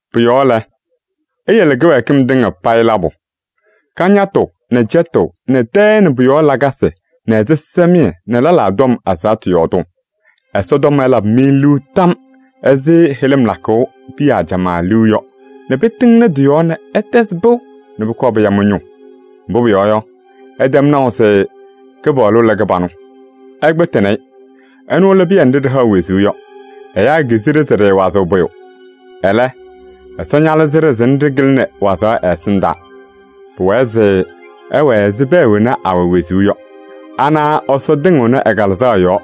Pʋ-yɔɔ lɛ, iyele kɩwɛɛkɩm tɩŋa payɩ labʋ: kañatʋ nɛ cɛtʋʋ nɛ tɛɛ nɛ pʋ-yɔɔ lakasɩ nɛ ɛzɩsɛmɩyɛ nɛ lɛlaa tɔm ɛzaɣtʋ yɔɔdʋʋ. Ɛsɔtɔm ɛlabɩ-mɩ liu tam ɛzɩ hɩlɩm lakʋʋ piya ajamaa liu yɔ nɛ pɩtɩŋnɩ tɩ-yɔɔ nɛ ɩtɛzɩ pɩʋ nɛ pʋkɔɔ pɩya mɩ-ñʋʋ. Mbʋ pʋyɔɔ yɔ, ɩtɛm naʋ se Kɩpaɣlʋ lɛ kɩbanʋ. Ɩkpɩtɩnɩ-ɩ. Ɛnʋ lɛ pɩyɛ nɖɩ ɖɩhaɣ wezuu yɔ, ɛyaa kizi-ɖɩ se ɖɩɩwazɩɣ pʋyʋ. Ɛlɛ, Ɛsɔ ñalɩzɩ-ɖɩ se nɖɩ kɩlɩnɩ wazaɣ ɛ-ɛsɩndaa. Pʋwɛɛ se ɩwɛɛ ɛzɩ pɛɛ wena awɛ wezuu yɔ. Anaɣ Ɛsɔ tɩŋɩɣnɩ ɛ-Kalɩzaɣ yɔɔ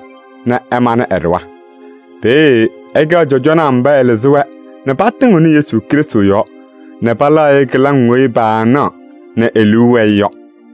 nɛ ɛmanɩ ɛ-ɖɩɣa. Peeye ɩkɛɣ cɔjɔnaa mba ɛlɩzɩ-wɛ nɛ patɩŋɩɣnɩ Yesu Krɩstʋ yɔɔ nɛ palaɣ-ɩ kɩlaŋ weyi paanaɣ nɛ e-liu wɛɛ-ɩ yɔ.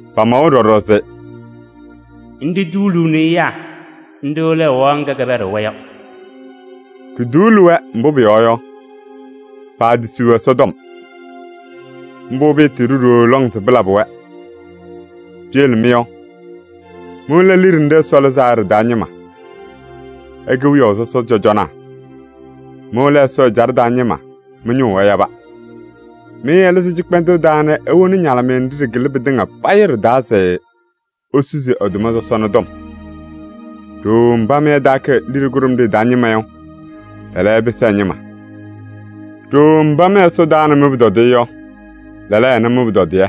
Pamawa ɖɔɖɔ se: “Nɖɩ tuuluuni ɛyaa, nɖɩ lɛ ɛwaɣ ŋga kɛpɛɖɩɣ-wɛ yɔ.” Ɖituuli-wɛ, mbʋ pʋyɔɔ yɔ, paatisiɣ Ɛsɔtɔm. Mbʋ pɩɩtɩɩɖʋ ɖooo lɔŋ se pɩlabɩ-wɛ. Piyele mɩ yɔ, mɩ lɛ liɖe nɖɩ Ɛsɔ lɩzaa yɔ ɖɩ-taa ñɩma. Ɩkɛ wiyaʋ sɔsɔ cɔjɔnaa. Mɩ lɛ Ɛsɔ ɛjaɖɛ taa ñɩma, mɩ-ñʋʋ ɛyaba. Mɩ ɛlɩzɩ cɩkpɛndʋʋ taa nɛ ewoni ɛ-ñalɩmɩyɛ nɖɩ ɖɩkɩlɩ pɩtɩŋa payɩ yɔ ɖɩ-taa se isusi ɛ-tʋma sɔsɔna tɔm. Ɖooo mba mɩ ɩtaakɛ liɖe kʋɖʋmɖɩyɛ taa ñɩma yɔ, lɛɛlɛɛyɔ, ɩpɩsɩ ɛ-ñɩma. Ɖooo mba mɩ Ɛsɔ taana mɩ-pʋtɔdɩyɛ yɔ, lɛɛlɛɛyɔ, ɛna mɩ-pʋtɔdɩyɛ.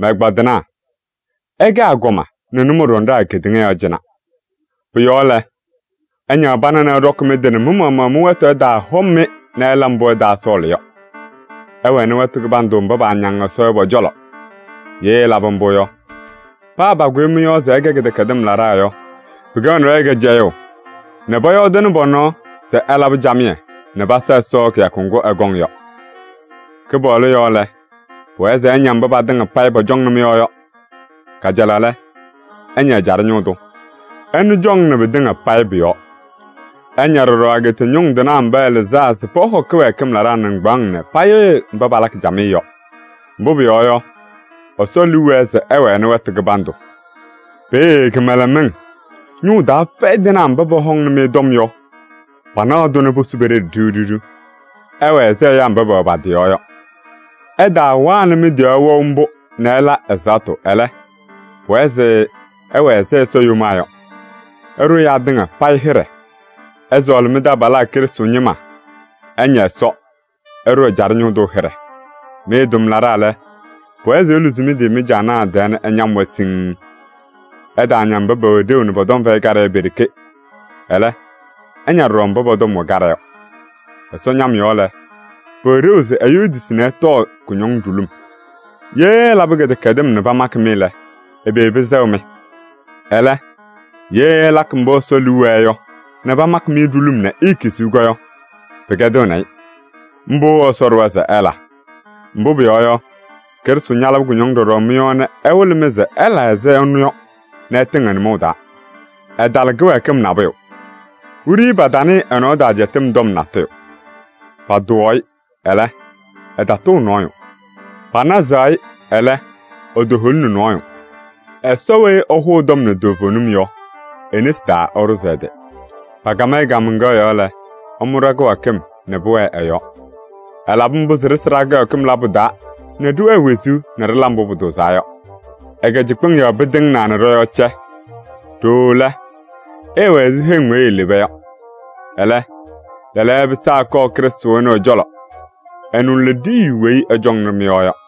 Mɛ-ɛgbaadɩnaa! Ɩkɛ agɔma nɛ nʋmɔɖɔnaa kedeŋa yɔɔ cɩnɛ. Pʋ-yɔɔ lɛ, ɩñaɣ pana nɛ ɩɖɔkɩ mɩ-tɩ nɛ mɩ-maɣmaɣ mɩ-wɛtʋ ɛtaahɔm-mɩ nɛ ɩla mbʋ ɩtaasɔɔlɩ yɔ. Ɩwɛnɩ wɛtʋ kɩbandʋ mba paañaŋ Ɛsɔ yɔ pɔ-cɔlɔ. Ye ɩlabɩ mbʋ yɔ, paa pakʋyʋʋ mɩ-yɔɔ se ɩkɛ kɩdɛkɛdɩm laɖaa yɔ, pɩkɛɣnɩ-wɛ kɩcɛyʋʋ nɛ pɔyɔɔdɩnɩ pɔ-nɔɔ se ɩlabɩ camɩyɛ nɛ pasa Ɛsɔ kɩyakʋ ŋgʋ ɛkɔŋ yɔ. Kɩpaɣlʋ yɔɔ lɛ, pʋwɛɛ se ɩña mba patɩŋa payɩ pɔcɔŋnɩ mɩ-yɔɔ yɔ. Kajalaɣ lɛ, ɩña ɛjaɖɛ ñʋʋ tʋ. Ɛnʋ cɔŋnɩnɩ pɩtɩŋa payɩ pʋ-yɔɔ. Ɩña ɖɔɖɔ ageeta ñʋŋ tɩnaa mba ɛlɩzaa se pɔhɔ kɩdɛkɛdɩm laɖaa nɩŋgbaaŋ nɛ payɩɣyɩ mba palakɩ camɩyɛ yɔ. Mbʋ pʋyɔɔ yɔ, Ɛsɔ liu wɛɛ se ɩwɛnɩ wɛtʋ kɩbandʋ. Peeye kɩmɛlɛmɩŋ, ñʋʋ taa fɛyɩ tɩnaa mba pɔhɔŋnɩ-mɩ tɔm yɔ, panaɣ-tʋ nɛ posu pe-ɖeɖe ɖiɣ ɖiɣ. Ɩwɛɛ ɛzɩ ɛyaa mba pɛwɛ pa-tɩ yɔɔ yɔ. Ɩtaawanɩ mɩ-tɩ yɔɔ wɛʋ mbʋ nɛ ɩla ɛzaɣtʋ, ɛlɛ, pʋwɛɛ se ɩwɛɛ ɛzɩ Ɛsɔ yomaa yɔ. Ɩɖʋ ɛyaa tɩŋa payɩ hɩɖɛ. Ɩsɔɔlɩ mɩ-taabalaa Krɩstʋ ñɩma. Ɩña Ɛsɔ. Ɩɖʋ ɛjaɖɛ ñʋʋ tʋ hɩɖɛ. Mɩ tʋmlaɖaa lɛ, pʋwɛɛ se iluzi mɩ-tɩ mɩ-caanaa tɛɛ nɛ ɩñam-wɛ siŋŋ. Ɩtaaña mba pɛwɛ ɖeu nɛ pɔ-tɔm fɛyɩ kaɖɛ yɔ pe-ɖeke. Ɛlɛ, ɩña ɖɔɖɔ mba pɔ-tɔm wɛ kaɖɛ yɔ. Ɛsɔ ñam yɔɔ lɛ, pʋwɛ ɖeu se ɛyʋ etisi nɛ ɛtɔɔ kʋñɔŋ ɖulum. Ye ɩlabɩ kɩdɛkɛdɩm nɛ pamakɩ-mɩ lɛ, ɛbɛ pɩsɛɣ-mɩ? Ɛlɛ, ye ɩlakɩ mbʋ Ɛsɔ liu wɛɛ yɔ nɛ pamakɩ-mɩ ɖulum nɛ iikiziɣ yɔ, pɩkɛdɩɣnɩ-ɩ. Mbʋ Ɛsɔ ɖʋwa se ɩla. Mbʋ pʋyɔɔ yɔ, Krɩstʋ ñalabɩ kʋñɔŋ ɖɔɖɔ mɩ-yɔɔ nɛ ɛwɩlɩ-mɩ se ɩla ɛzɩ ɛnʋ yɔ nɛ ɩtɩŋ ɛ-nʋmɔʋ taa. Ɛtala kɩwɛɛkɩm nabʋyʋ. Wiɖiyi patanɩɩ ɛ-nɔɔ taa cɛtɩm tɔm natʋyʋ. Patʋwaɣ-ɩ, ɛlɛ, ɛtatʋʋ nɔɔyʋ. Panazaɣ-ɩ, ɛlɛ, etoholini nɔɔyʋ. Ɛsɔ weyi ɛhʋʋ tɔm nɛ toovenim yɔ, e-nesi taa ɛɖʋzɩ ɛ-tɩ. Pakam-ɩ kaamaŋkaɣ yɔɔ lɛ, ɛmʋ ɖa-kɩwɛɛkɩm nɛ pʋwɛɛ ɛ-yɔɔ. Ɛlabɩ mbʋ se ɖɩsɩ ɖa-kɩwɛɛkɩm labʋ taa nɛ ɖɩwɛɛ wezuu nɛ ɖɩla mbʋ pʋtʋʋzaa yɔ. Ɛ-kɩcɩkpɩŋ yɔɔ pɩtɩŋnaa nɛ mɩ-yɔɔ cɛ. Ɖooo lɛ, ɩɩwɛ ɛzɩ heŋ weyi ileba yɔ. Ɛlɛ, lɛɛlɛɛyɔ ɩpɩsaa ɩkɔɔ Krɩstʋ ɛnʋ ɛ-cɔlɔ. Ɛnʋ lɛ ɖiyiyu weyi ɛcɔŋnɩ mɩ-yɔɔ yɔ.